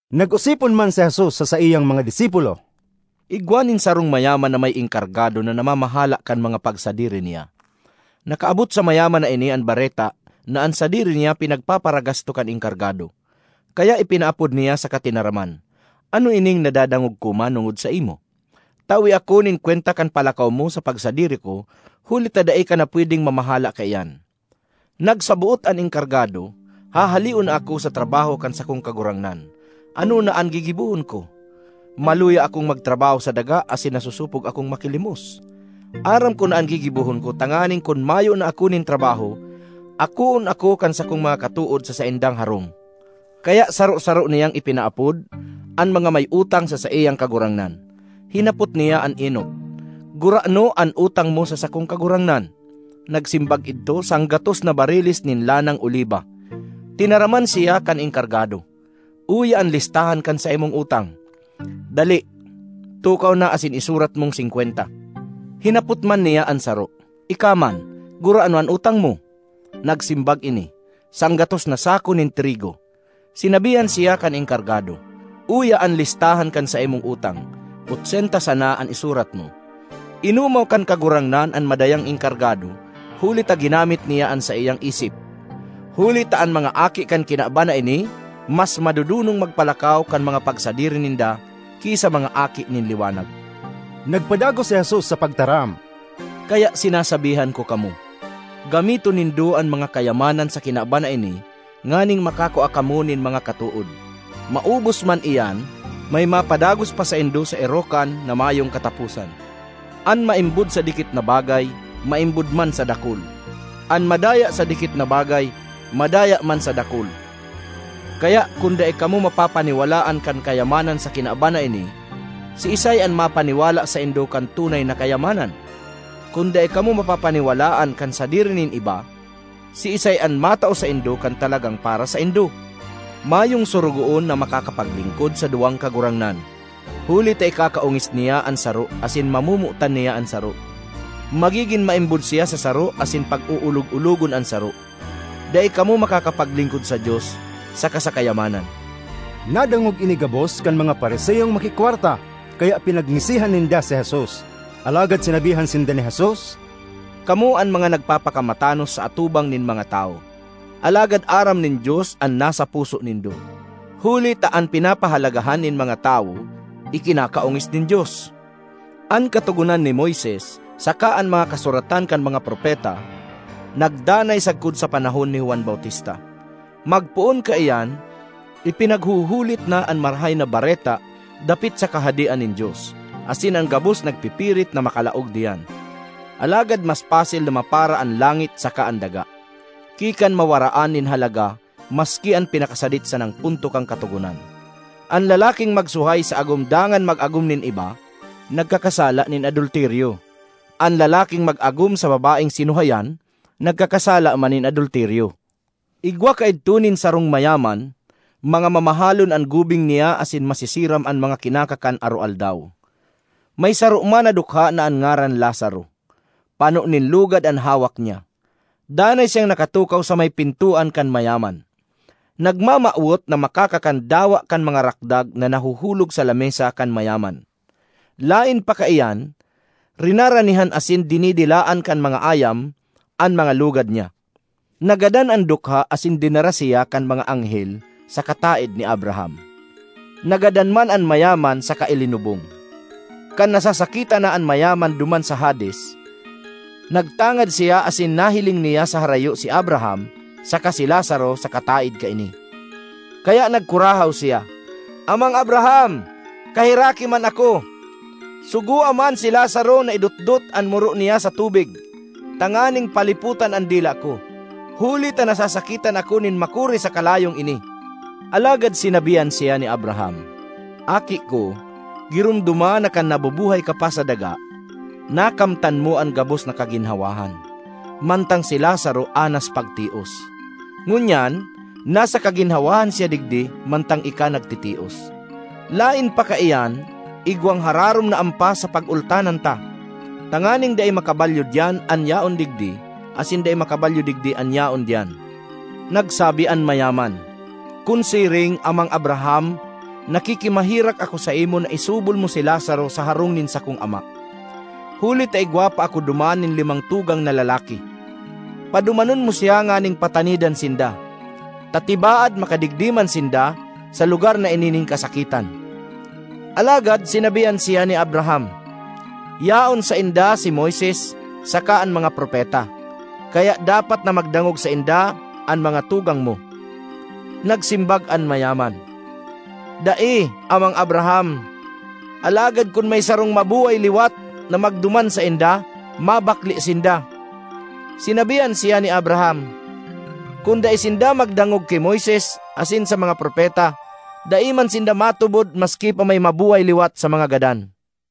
Nag-osipon man si Jesus sa saiyang mga disipulo, “Igwa nin sarong mayaman na may enkargado na namamahala kan mga pagsadiri niya. Nakaabot sa mayaman na ini an bareta na an sadiri niya pinagpaparagasto kan enkargado. Kaya ipinaapod niya saka tinaraman, ‘Ano ining nadadangog ko manongod saimo? Tawe ako nin kwenta kan palakaw mo sa pagsadiri ko huli ta dai ka na pwedeng mamahala kaiyan.’ Nagsaboot an enkargado, ‘Hahaleon na ako sa trabaho kan sakong kagurangnan. Ano na an gigibohon ko? Maluya akong magtrabaho sa daga asin nasosopog akong makilimos. Aram ko na an gigibohon ko tanganing kun mayo na ako nin trabaho, akoon ako kan sakong mga katood sa saindang harong!’ Kaya saro-saro niyang ipinaapod an mga may utang sa saiyang kagurangnan. Hinapot niya an enot, ‘Gurano an utang mo sa sakong kagurangnan?’ Nagsimbag idto, ‘Sanggatos na bariles nin lanang oliba.’ Tinaraman siya kan enkargado, ‘Uya an listahan kan saimong utang. Dali, tukaw na asin isurat mong singkwenta.’ Hinapot man niya an saro, ‘Ika man, gurano an utang mo?’ Nagsimbag ini, ‘Sanggatos na sako nin trigo.’ Sinabihan siya kan enkargado, ‘Uya an listahan kan saimong utang; otsenta sana an isurat mo.’ Inomaw kan kagurangnan an madayang enkargado huli ta ginamit niya an saiyang isip. Huli ta an mga aki kan kinaban na ini mas madodonong magpalakaw kan mga pagsadiri ninda ki sa mga aki nin liwanag.” Nagpadagos si Jesus sa pagtaram, “Kaya sinasabihan ko kamo, gamiton nindo an mga kayamanan sa kinaban na ini nganing makakua kamo nin mga katood. Maubos man iyan, may mapadagos pa saindo sa erokan na mayong kataposan. An maimbod sa dikit na bagay, maimbod man sa dakul; an madaya sa dikit na bagay, madaya man sa dakul. Kaya kun dai kamo mapapaniwalaan kan kayamanan sa kinaban na ini, siisay an mapaniwala saindo kan tunay na kayamanan? Kun dai kamo mapapaniwalaan kan sadiri nin iba, siisay an matao saindo kan talagang para saindo? ”Mayong sorogoon na makakapaglingkod sa duwang kagurangnan, huli ta ikakaongis niya an saro asin mamomotan niya an saro; magigin maimbod siya sa saro asin pag-oolog-ologon an saro. Dai kamo makakapaglingkod sa Dios saka sa kayamanan.” Nadangog ini gabos kan mga Fariseong makikwarta, kaya pinagngisihan ninda si Jesus. Alagad sinabihan sinda ni Jesus, “Kamo an mga nagpapakamatanos sa atubang nin mga tawo, alagad aram nin Dios an nasa puso nindo. Huli ta an pinapahalagahan nin mga tawo, ikinakaongis nin Dios. ”An Katogonan ni Moises saka an mga kasuratan kan mga propeta nagdanay sagkod sa panahon ni Juan Bautista. Magpoon kaiyan, ipinaghuhulit na an Marahay na Bareta dapit sa Kahadean nin Dios, asin an gabos nagpipirit na makalaog diyan. Alagad mas pasil na mapara an langit saka an daga, ki kan mawaraan nin halaga maski an pinakasadit sanang punto kan Katogonan. ”An lalaking magsuhay sa agom dangan mag-agom nin iba, nagkakasala nin adulteryo; an lalaking mag-agom sa babaeng sinuhayan, nagkakasala man nin adulteryo. ”Igwa kaidto nin sarong mayaman. Mga mamahalon an gubing niya asin masisiram an mga kinakakan aroaldaw. May saro man na dukha na an ngaran Lazaro; pano nin lugad an hawak niya. Danay siyang nakatukaw sa may pintoan kan mayaman, nagmamawot na makakakan dawa kan mga rakdag na nahuhulog sa lamesa kan mayaman. Laen pa kaiyan, rinaranihan asin dinidilaan kan mga ayam an mga lugad niya. Nagadan an dukha asin dinara siya kan mga anghel sa kataed ni Abraham. Nagadan man an mayaman saka ilinubong. Kan nasasakitan na an mayaman duman sa Hades, nagtangad siya asin nahiling niya sa harayo si Abraham saka si Lazaro sa kataed kaini. Kaya nagkurahaw siya, ‘Amang Abraham! Kaheraki man ako! Sugoa man si Lazaro na idotdot an muro niya sa tubig tanganing palipotan an dila ko, huli ta nasasakitan ako nin makuri sa kalayong ini!’ Alagad sinabihan siya ni Abraham, ‘Aki ko, giromdoma na kan nabubuhay ka pa sa daga, nakamtan mo an gabos na kaginhawahan, mantang si Lazaro anas pagtios. Ngunyan nasa kaginhawahan siya digdi mantang ika nagtitios. Laen pa kaiyan, igwang hararom na ampas sa pagultanan ta, tanganing dai makabalyo diyan an yaon digdi, asin dai makabalyo digdi an yaon diyan.’ Nagsabi an mayaman, ‘Kun siring, Amang Abraham, nakikimaherak ako saimo na isubol mo si Lazaro sa harong nin sakong ama, huli ta igwa pa ako duman nin limang tugang na lalaki. Padumanon mo siya nganing patanidan sinda, ta tibaad makadigdi man sinda sa lugar na ini nin kasakitan.’ Alagad sinabihan siya ni Abraham, ‘Yaon sainda si Moises saka an mga propeta; kaya dapat na magdangog sainda an mga tugang mo.’ Nagsimbag an mayaman, ‘Dai, Amang Abraham; alagad kun may sarong mabuhay liwat na magduman sainda, mabakle sinda.’ Sinabihan siya ni Abraham, ‘Kun dai sinda magdangog ki Moises asin sa mga propeta, dai man sinda matubod maski pa may mabuhay liwat sa mga gadan.’”